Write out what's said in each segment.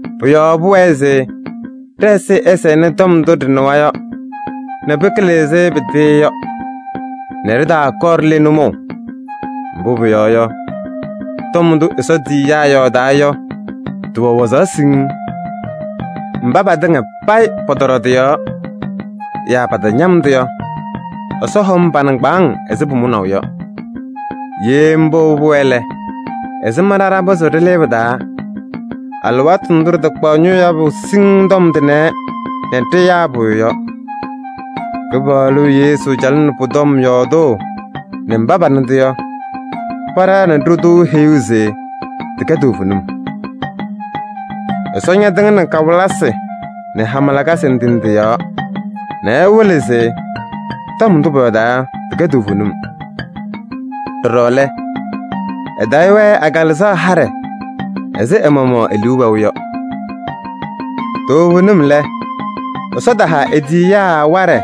Pʋ-yɔɔ pʋwɛɛ se ɖɛ-ɛzɩyɛ ɛsɛnɩ tɔm ndʋ ɖɩnɩwa yɔ nɛ pɩkɩlɩ ɛzɩ pɩtɩɩ yɔ nɛ ɖɩtaakɔɔ ɖile nʋmɔʋ. Mbʋ pʋyɔɔ yɔ, tɔm ndʋ Ɛsɔ tiyiyaa yɔɔdaa yɔ tɩwɛ wazaɣ siŋŋ. Mba patɩŋa payɩ pɔtɔɖɔ tɩ-yɔɔ yaa patañam-tʋ yɔ, Ɛsɔ hɔm pa-nɩŋgbaaŋ ɛzɩ pʋmʋnaʋ yɔ. Ye mbʋ pʋwɛɛ lɛ, ɛzɩma ɖa ɖapɩzɩɣ ɖɩlɩɩ pɩ-taa alɩwaatʋ ndʋ ɖɩtakpaɣ ñʋʋ yabʋ siŋŋ tɔm tʋnɛ nɛ ɖɩyaa pʋyʋ yɔ? Kɩpaɣlʋ Yesu calɩnɩ pʋ-tɔm yɔɔdʋʋ nɛ mba panɩ-tʋ yɔ, paɖaɣnɩ-ɖʋ-tʋ heyuu se tɩkɛ toovenim. Ɛsɔ ñatɩŋnɩ kawɩlɩsɩ nɛ hama lakasɩ ndɩ ndɩ pɔ-yɔɔ nɛ ɛwɩlɩ se tɔm ndʋ pɔyɔɔdaa yɔ, tɩkɛ toovenim. Ɖɔɖɔ lɛ, ɛtayɩ-wɛ ɛ-Kalɩzaɣ haɖɛ ɛzɩ ɛ-maɣmaɣ e-liu wɛʋ yɔ. Toovenim lɛ, Ɛsɔ taha e-tiyiyaa waɖɛ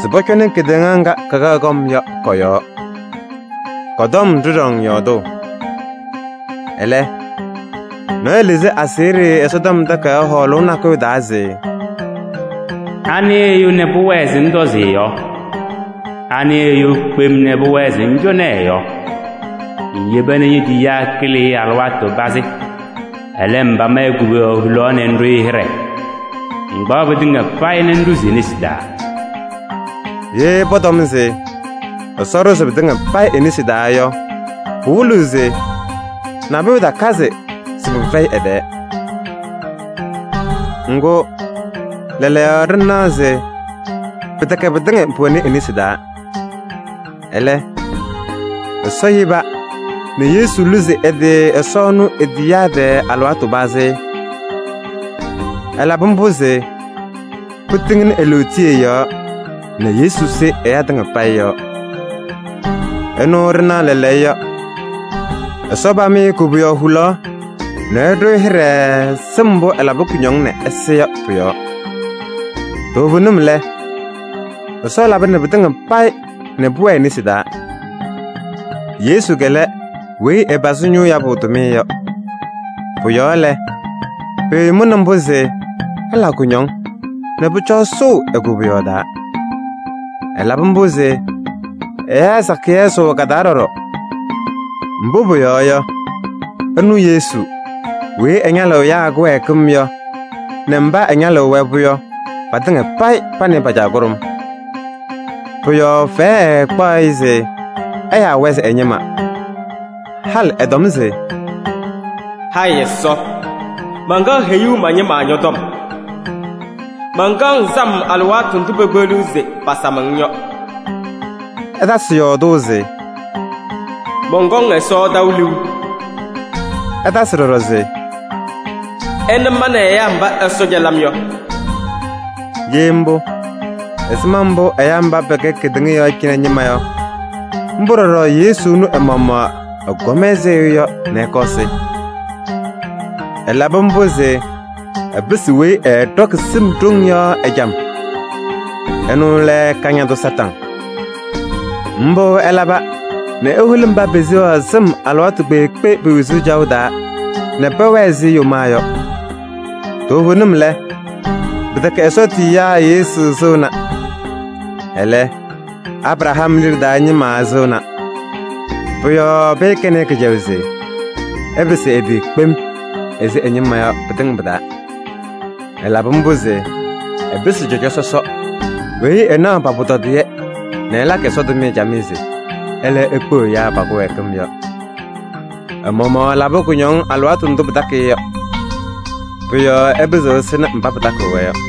se pɔcɔnɩ kedeŋa ŋga kakaɣ kɔm yɔ kɔ-yɔɔ. Kɔ-tɔm ɖɩɖɔŋ yɔɔdʋʋ. Ɛlɛ, nɔɔyʋ lɩzɩ aseɣɖe Ɛsɔtɔm Takayaɣ hɔɔlʋʋ nakʋyʋ taa se: “Anɩ ɛyʋ nɛ pʋwɛɛ se ŋtɔzɩ ɛ-yɔɔ? Anɩ ɛyʋ kpem nɛ pʋwɛɛ se ŋcɔnɩ ɛ-yɔɔ? Ŋyeba nɛ ñe-tiyiyaa kɩlɩ-ɩ alɩwaatʋ pazɩ. Ɛlɛ, ŋpam-ɩ koboyaɣ hulaɣ nɛ ŋɖʋ-ɩ hɩɖɛ. Ŋkpaɣ pɩtɩŋa payɩ nɛ ŋɖʋzɩ e-nesi taa.” Ye pɔtɔm se Ɛsɔ ɖʋzɩ pɩtɩŋa payɩ e-nesi taa yɔ, pɩwɩlɩɣ se nabʋyʋ takazɩ se pɩfɛyɩ ɛ-tɛɛ. Ŋgʋ lɛɛlɛɛyɔ, ɖɩnaɣ se pɩtɛkɛ pɩtɩŋa pʋwɛnɩ e-nesi taa. Ɛlɛ, Ɛsɔ yeba nɛ Yesu luzi ɛ-tɩ Ɛsɔ ɛnʋ e-tiyiyaa tɛɛ alɩwaatʋ pazɩ. Ɛlabɩ mbʋ se pɩtɩŋnɩ e-lootiye yɔɔ nɛ Yesu sɩ ɛyaa tɩŋa payɩ yɔɔ. Ɛnʋ ɖɩnaɣ lɛɛlɛɛyɔ, Ɛsɔ pam-ɩ koboyaɣ hulaɣ nɛ ɛɖʋ-ɩ hɩɖɛ sɩm mbʋ ɛlabɩ kʋñɔŋ nɛ ɛsɩ yɔ pʋ-yɔɔ. Toovenim lɛ, Ɛsɔ labɩnɩ pɩtɩŋa payɩ nɛ pʋwɛɛ e-nesi taa. Yesu lɛ weyi ɛpazɩ ñʋʋ yabʋ tʋmɩyɛ yɔ. Pʋ-yɔɔ lɛ, pɩɩmʋnɩ mbʋ se ɛla kʋñɔŋ nɛ pʋcɔ ɛsʋʋ e-koboyaɣ taa. Ɛlabɩ mbʋ se ɛyaa sakɩyɛ ɛsʋʋ ka-taa ɖɔɖɔ. Mbʋ pʋyɔɔ yɔ, ɛnʋ Yesu weyi ɛñalɩɣ ɛyaa kɩwɛɛkɩm yɔ nɛ mba ɛñalɩɣ-wɛ-pʋ yɔ, patɩŋa payɩ pa nɛ ɩ pa-Caa kʋɖʋm. Pʋ-yɔɔ fɛyɛ ɛɛkpaɣ-ɩ se ɛyaa-wɛ se ɛ-ñɩma. Halɩ ɛtɔm se: “Hayɩ Ɛsɔ! Mankaɣ heyuu ma-ñɩma ñɔ-tɔm. Mankaɣ-ŋ sam alɩwaatʋ ndʋ pekpeɣliɣ se pasam-ŋ yɔ.” Ɛtasɩ yɔɔdʋʋ se: “Mɔnkɔŋ Ɛsɔ taʋ liu.” Ɛtasɩ ɖɔɖɔ se: “Ɩna ma nɛ ɛyaa mba Ɛsɔ cɛlɩ-m yɔ!” Ye mbʋ, ɛzɩma mbʋ ɛyaa mba pɛkɛ kedeŋa yɔɔ cɩnɛ ñɩma yɔ, mbʋ ɖɔɖɔ Yesu ɛnʋ ɛ-maɣmaɣ ɛkɔm ɛzɩ ɛyʋ yɔ nɛ ɛkɔɔ ɛsɩ. Ɛlabɩ mbʋ se ɛpɩsɩ weyi ɛɛɖɔkɩ sɩm ɖoŋ yɔ ɛjam: ɛnʋ lɛ Kañadʋ Satanɩ. Mbʋ ɛlaba nɛ eholi mba peseɣaɣ sɩm alɩwaatʋ kpeekpe pe-wezuu caɣʋ taa nɛ pɛwɛɛ ɛzɩ yomaa yɔ. Toovenim lɛ, pɩtɛkɛ Ɛsɔ tiyiyaa Yesu sɩŋna. Ɛlɛ, Abraham liɖe taa ñɩma ɛsɩŋna. Pʋ-yɔɔ pɩɩkɛnɩ-ɩ kɩcɛyʋʋ se ɛpɩsɩ ɛ-tɩ kpem ɛzɩ ɛ-ñɩma yɔ pɩtɩŋa pɩ-taa. Ɛlabɩ mbʋ se ɛpɩsɩ cɔjɔ sɔsɔ weyi ɛnaɣ pa-pʋtɔdɩyɛ nɛ ɛlakɩ Ɛsɔ tʋmɩyɛ camɩyɛ se ɛlɛ ekpeɣ ɛyaa pa-kɩwɛɛkɩm yɔ. Ɛ-maɣmaɣ ɛlabɩ kʋñɔŋ alɩwaatʋ ndʋ pɩtakɩ-ɩ yɔ. Pʋ-yɔɔ ɛpɩzɩɣ ɛsɩnɩ mba pɩtakɩɣ-wɛ yɔ.